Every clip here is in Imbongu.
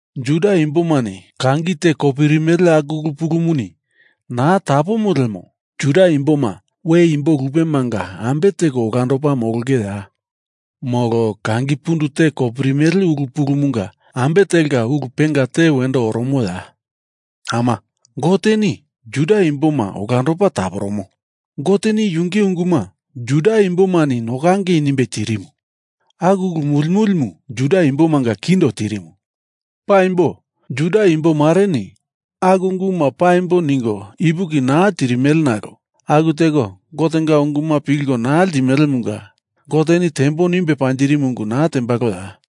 Juda imbomani kangi te kopirimele aku ulu pulumuni naa tapomo lemo Juda imboma we imbo lupemanga ambe teko olandopa molongeya? Molo kangi pundu te kopirimele ulu pulumunga ambe telka ulu penga te wendo oromoya? Ama, Goteni Juda imboma olandopa taporomo. Goteni yunge unguma Juda imbomani nokangei nimbe tirimu. Aku ulu muli mulimu Juda imbomanga kindo tirimu. Paimbo, Juda imbo mareni aku unguma paimbo ningo ipuki naa tirimele nalo aku teko Gotenga unguma pilko naa ltimelemunga Goteni tembo nimbe panjirimu ungu naa tembaloya?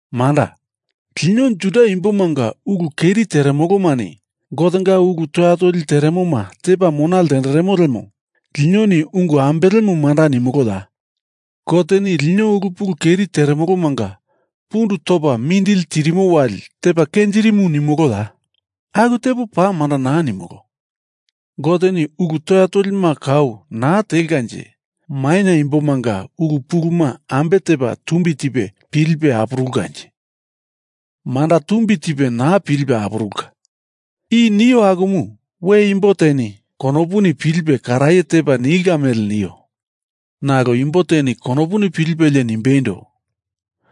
Manda, lino Juda imbomanga ulu keri teremolomani Gotenga ulu toya toli teremoma tepa mona ltenderemo lemo linoni ungu ambelemu manda nimoloya? Goteni lino ulu pulu keri teremolomanga pundu topa mindili tirimo wali tepa kenjirimu nimoloya? Aku tepo paa manda naa nimolo! Goteni ulu toya tolima kau naa telkanje maina imbomanga ulu puluma ambe tepa tumbi tipe pilipe apurulkanje? Manda tumbi tipe naa pilipe apurulka. I nio akumu we imbo teni konopuni pilipe karaye tepa nilka mele nio. Nalo imbo teni konopuni pilipelie nimbeindo,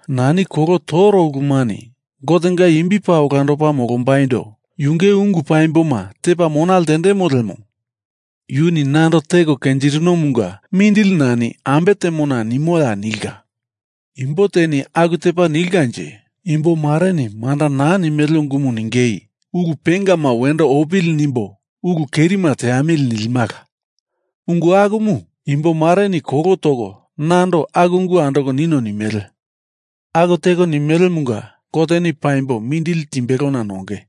nani kolo toro ulumani Gotenga imbi paa olandopa molombaindo yunge ungu paimboma tepa mona lendemo lemo yuni nando teko kenjirinomunga mindili nani ambe temona nimoya nilka. Imbo teni aku tepa nilkanje imbomareni manda naa nimele ungumu ningei ulu pengama wendo opili nimbo ulu kerima teamili nilimala. Ungu akumu imbo mareni kolo toko nando aku ungu andoko nino nimele. Aku teko nimelemunga Goteni paimbo mindili timbelona nonge.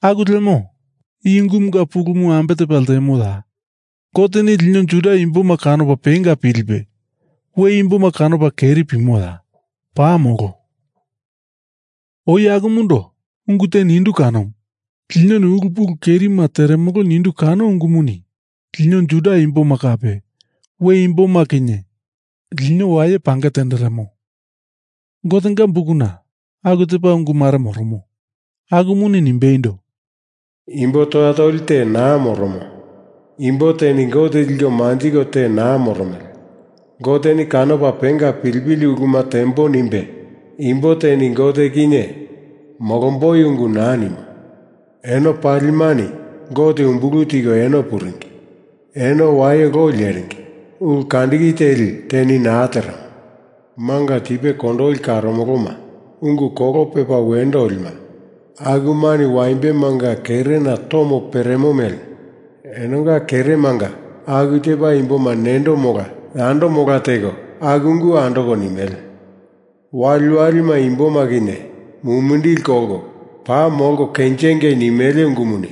Aku lemo i ungumunga pulumu ambe tepa ltemoya? Goteni lino Juda imboma kanopa penga pilipe we imboma kanopa keri pimoya? Paa molo! Oi akumundo ungu te nindu kanomu. Linoni ulu pulu kerima teremolo nindu kano ungumuni lino Juda imboma kape we imboma kinye lino waye pange tenderemo. Gotenga Bukuna aku tepa ungu mare moromo. Akumuni nimbeindo, Imbo toya toli te naa moromo. Imbo teni Gote liko manjiko te naa moromele. Goteni kanopa penga pilipili uluma tembo nimbe imbo teni Gote kinye molomboi ungu naa nimo. Eno palimani Gote umbulu tiko eno puringi. Eno waye loi leringi. Ulu kandiki teli teni naa teremo. Manga tipe kondoli karoloma, ungu kolo pepa wendo olima akumani waimbemanga kerena tomo peremo mele enonga keremanga aku tepa imboma nendo mola yando mola teko aku ungu andoko nimele. Waliwalima imboma kinye mumindili kolko paa molko kenjengei nimele ungumuni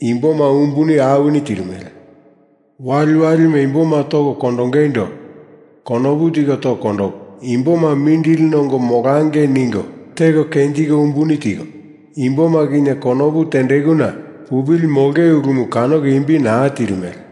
imboma umbuni awini tirimele. Waliwalima imboma toko kondongeindo konopu tiko toko kondoko, imboma mindili nongo molangei ningo teko kenjiko umbuni tiko, imboma kinye konopu tendekuna pupili molonge ulumu kanoko imbi naa tirimele.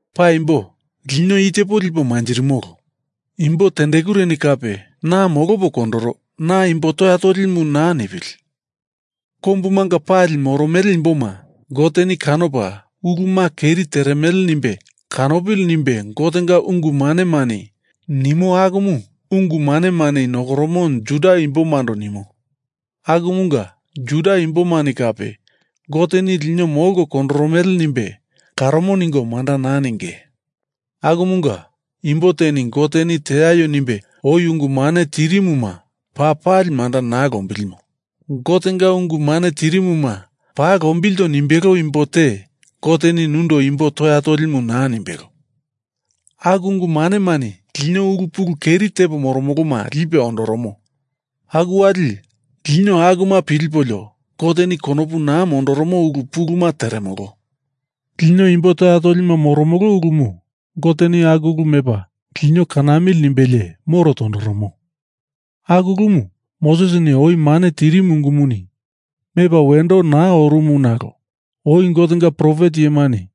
Paimbo lino i tepo lipo manjirimolo. Imbo tendekureni kape na molopo kondoro, na imbo toya tolimu naa nipili. Kombumanga pali moromele imboma Goteni kanopa uluma keri teremele nimbe kanopili nimbe Gotenga ungu manemani nimo akumu ungu manemani nokoromo Juda imbomando nimo. Akumunga Juda imbomani kape Goteni lino molko kondoromele nimbe karomo ningo manda naa ninge. Akumunga, imbo teni Goteni teaio nimbe oi ungu mane tirimuma paa pali manda naa lombilimo. Gotenga ungu mane tirimuma paa lombilto nimbelo imbo te Goteni nundo imbo toya tolimu naa nimbelo. Aku ungu manemani lino ulu pulu keri tepo moromoloma lipe ondoromo aku wali lino akuma pilipolio Goteni konopu naa mondoromo ulu puluma teremolo. Lino imbo toya tolima molomolo ulumu Goteni aku ulu mepa lino kanamili nimbelie moro tondoromo. Aku ulumu Mosesini oi mane tirimu ungumuni mepa wendo naa orumu nalo oi Gotenga profet iyemani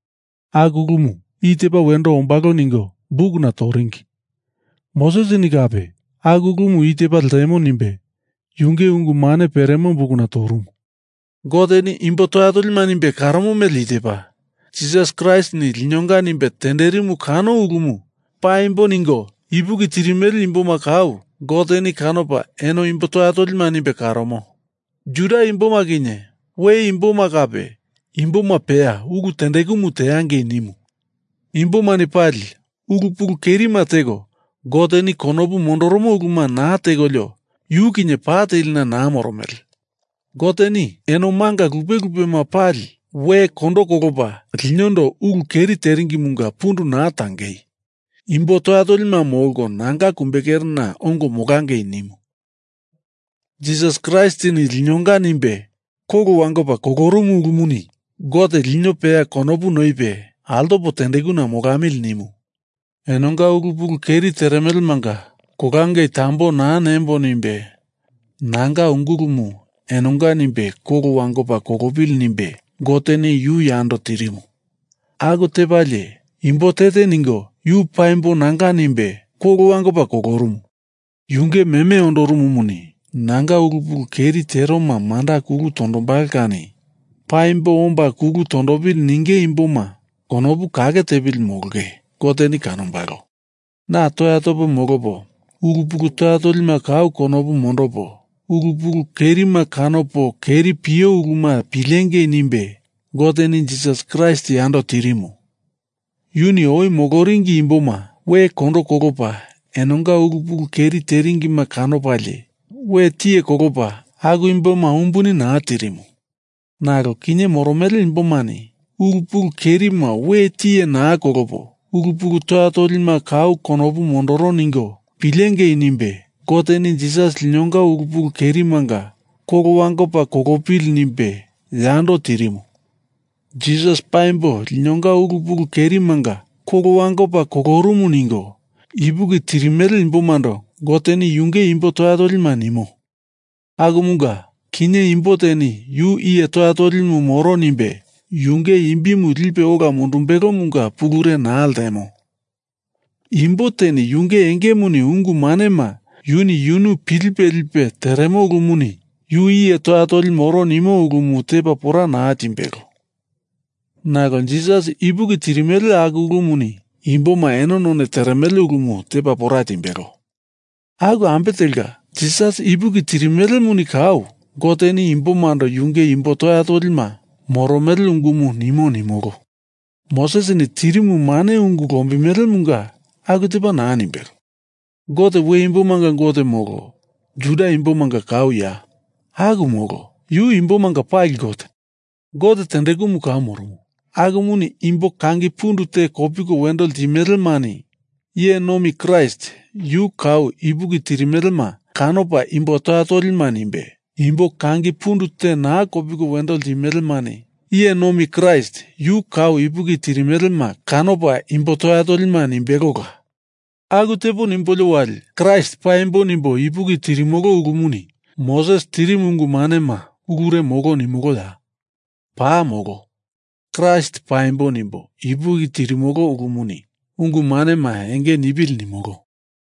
aku ulumu i tepa wendo ombalo ningo bukuna toringi. Mosesini kape aku ulumu i tepa ltemo nimbe yunge ungu mane peremo bukuna torumu. Goteni imbo toya tolima nimbe karomo mele i tepa, Jisas Kraistini linonga nimbe tenderimu kano ulumu paimbo ningo ipuki tirimele imboma kau Goteni kanopa eno imbo toya tolima nimbe karomo. Juda imboma kinye, we imboma kape, imboma peya ulu tendekumu teangei nimu. Imbomani pali ulu pulu kerima teko Goteni konopu mondoromo uluma naa tekolio yu kinye pa telina naa moromele. Goteni eno manga lupe lupema pali we kondo kolopa linondo ulu keri teringimunga pundu naa tangei, imbo toya tolima molko, nanga kumbekerena ongo molangei nimu. Jisas Kraistini linonga nimbe kolo wangopa kolorumu ulumuni Gote lino peya konopu noipe altopo tendekuna molamili nimu. Enonga ulu pulu keri teremelemanga kolangei tambo naa nembo nimbe nanga ungulumu enonga nimbe kolo wangopa kolopili nimbe Goteni yu yando tirimu. Aku tepalie imbo te te ningo yu paimbo nanga nimbe kolo wangopa kolorumu. Yunge meme ondorumumuni nanga ulu pulu keri teroma manda kulu tondombalo kani paimbo omba kulu tondopili ninge imboma konopu kake tepili molonge Goteni kanombalo. Na toya topo molopo ulu pulu toya tolima kau konopu mondopo, ulu pulu kerima kanopo keri pio uluma pilengei nimbe Goteni Jisas Kraist yando tirimu. Yuni oi moloringi imboma we kondo kolopa enonga ulu pulu keri teringima kanopalie we tiye kolopa aku imboma umbuni naa tirimu. Nalo kinye moromele imbomani ulu pulu kerima we tiye naa kolopo ulu pulu toya tolima kau konopu mondoro ningo pilengei nimbe, Goteni Jisas linonga ulu pulu kerimanga kolo wangopa kolopili nimbe yando tirimu. Jisas paimbo linonga ulu pulu kerimanga kolo wangopa kolorumu ningo ipuki tirimele imbomando Goteni yunge imbo toya tolima nimo. Akumunga, kinye imbo teni yu iye toya toli moro nimbe yunge imbimu lipe ola mundumbelomunga pulure naa ltemo. Imbo teni yunge engemuni ungu manema yuni yunu pilipe lipe teremo ulumuni yu iye toya toli moro nimo ulumu tepa pora naa timbelo. Nalo Jisas ipuki tirimele aku ulumuni imboma eno none teremele ulumu tepa pora timbelo. Aku ambe telka, Jisas ipuki tirimelemuni kau Goteni imbomando yunge imbo toya tolima moromele ungumu nimo nimolo. Mosesini tirimu mane ungu lombimelemunga aku tepa naa nimbelo. Gote we imbomanga Gote, molo Juda imbomanga kauya? Aku molo. Yu imbomanga pali Gote. Gote tendekumu kau moromo, akumuni imbo kangi pundu te kopiko wendo limelemani iye nomi Kraist yu kau ipuki tirimelema kanopa imbo toya tolima nimbe, imbo kangi pundu te naa kopiko wendo limelemani iye nomi Kraist yu kau ipuki tirimelema kanopa imbo toya tolima nimbelola. Aku tepo nimbolio wali Kraist paimbo nimbo ipuki tirimolo ulumuni Moses tirimu ungu manema ulure molo nimoloya? Paa molo. Kraist paimbo nimbo ipuki tirimolo ulumuni ungu manema enge nipili nimolo.